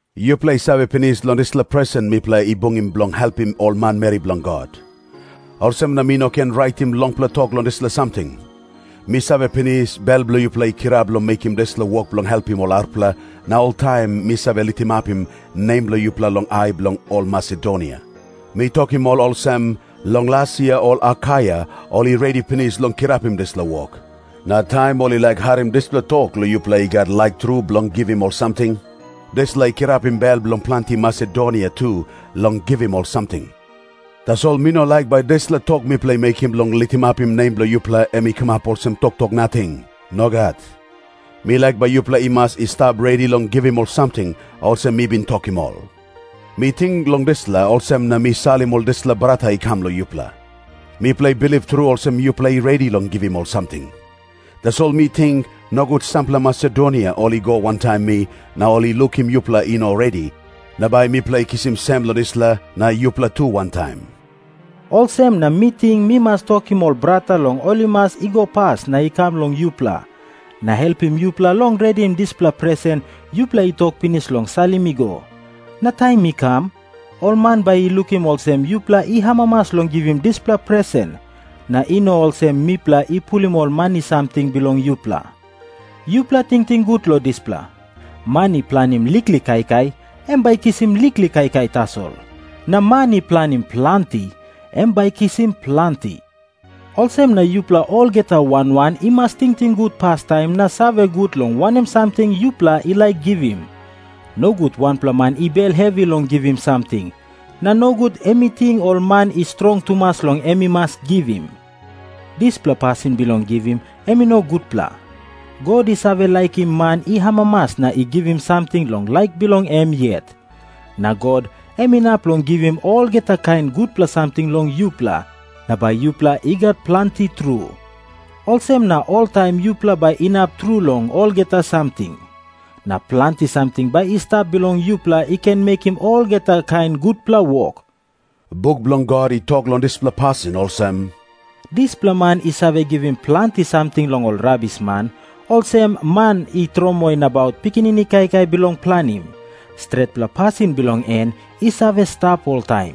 Yupela i save pinis long dispela presen mipela i bungim bilong helpim ol manmeri bilong God. Olsem na mi no ken raitim longpela tok long dispela samting. Mi save pinis, bel bilong yupela i kirap long mekim dispela wok bilong helpim ol arapela, na oltaim mi save litimapim nem bilong yupela long ai bilong ol Masedonia. Mi tokim ol olsem, “Long las yia ol Akaia ol i redi pinis long kirapim dispela wok.” Na taim ol i harim dispela tok long yupela i gat laik tru bilong givim ol samting, dispela i kirapim bel bilong planti Masedonia tu long givim ol samting. Tasol mi no laik bai dispela tok mipela i mekim bilong litimapim nem bilong yupela em i kamap olsem toktok nating. Nogat. Mi laik bai yupela i mas i stap redi long givim ol samting, olsem mi bin tokim ol. Mi ting long dispela, olsem na mi salim ol dispela brata i kam long yupela. Mipela i bilip tru olsem yupela i redi long givim ol samting. Tasol mi ting, nogut sampela Masedonia ol i go wantaim mi na ol i lukim yupela i no redi, na bai mipela i kisim sem long dispela, na yupela tu wantaim. Olsem na mi ting mi mas tokim ol brata long ol i mas i go pas na i kam long yupela, na helpim yupela long redim dispela presen yupela i tok pinis long salim i go. Na taim mi kam, ol man bai i lukim olsem yupela i amamas long givim dispela presen, na i no olsem mipela i pulim ol mani samting bilong yupela. Yupela tingting gut long dispela. Man i planim liklik kaikai, em bai i kisim liklik kaikai tasol. Na man i planim planti, em bai i kisim planti. Olsem na yupela olgeta wan wan i mas tingting gut pastaim na save gut long wanem samting yupela i laik givim. Nogut wanpela man i bel hevi long givim samting, na nogut em i ting ol man i strong tumas long em i mas givim. Dispela pasin bilong givim em i no gutpela. God i save laikim man i amamas na i givim samting long laik bilong em yet. Na God em inap long givim olgeta kain gutpela samting long yupela, na bai yupela i gat planti tru. Olsem na oltaim yupela bai inap tru long olgeta samting, na planti samting bai i stap bilong yupela i ken mekim olgeta kain gutpela wok. Buk bilong God i tok long dispela pasin olsem, “Dispela man i save givim planti samting long ol rabisman, olsem man i tromoi nabaut pikinini kaikai bilong planim. Stretpela pasin bilong en i save stap oltaim.”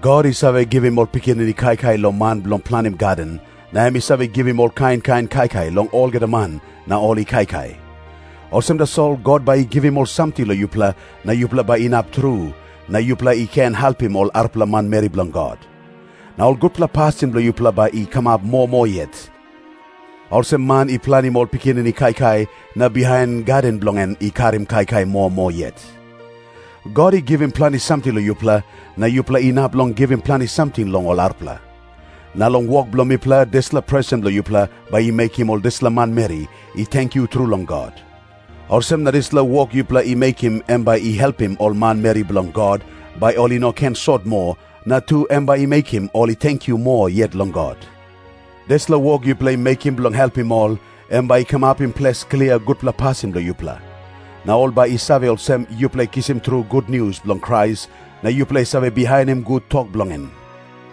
God i save givim ol pikinini kaikai long man bilong planim gaden, na em i save givim ol kain kain kaikai long olgeta man na ol i kaikai. Olsem tasol God bai i givim ol samting long yupela na yupela bai inap tru, na yupela i ken helpim ol arapela manmeri bilong God. Na ol gutpela pasin bilong yupela bai i kamap moa moa yet, olsem man i planim ol pikinini kaikai na bihain gaden bilong en i karim kaikai moa moa yet. God i givim planti samting long yupela, na yupela inap long givim planti samting long ol arapela. Na long wok bilong mipela dispela presen bilong yupela bai i mekim ol dispela manmeri i tenkyu tru long God. Olsem na dispela wok yupela i mekim em bai i helpim ol manmeri bilong God, bai ol i no ken sot moa, na tu em bai i mekim ol i tenkyu moa yet long God. Dispela wok yupela i mekim bilong helpim ol, em bai i kamapim ples klia gutpela pasin bilong yupela. Na ol bai i save olsem, yupela i kisim tru gutnius bilong Krais na yupela i save bihainim gut tok bilong en.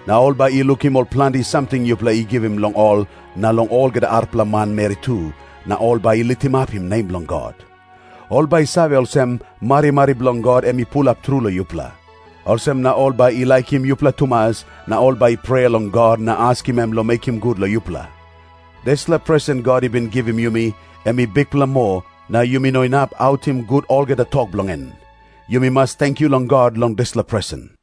Na ol bai i lukim ol planti samting yupela i givim long ol na long olgeta arapela manmeri tu, na ol bai i litimapim nem bilong God. Ol bai i save olsem, marimari bilong God em i pulap tru long yupela. Olsem na ol bai i laikim yupela tumas, na ol bai i prea long God na askim em long mekim gut long yupela. Dispela presen God i bin givim yumi, em i bikpela moa, na yumi no inap autim gut olgeta tok bilong en. Yumi mas tenkyu long God long dispela presen.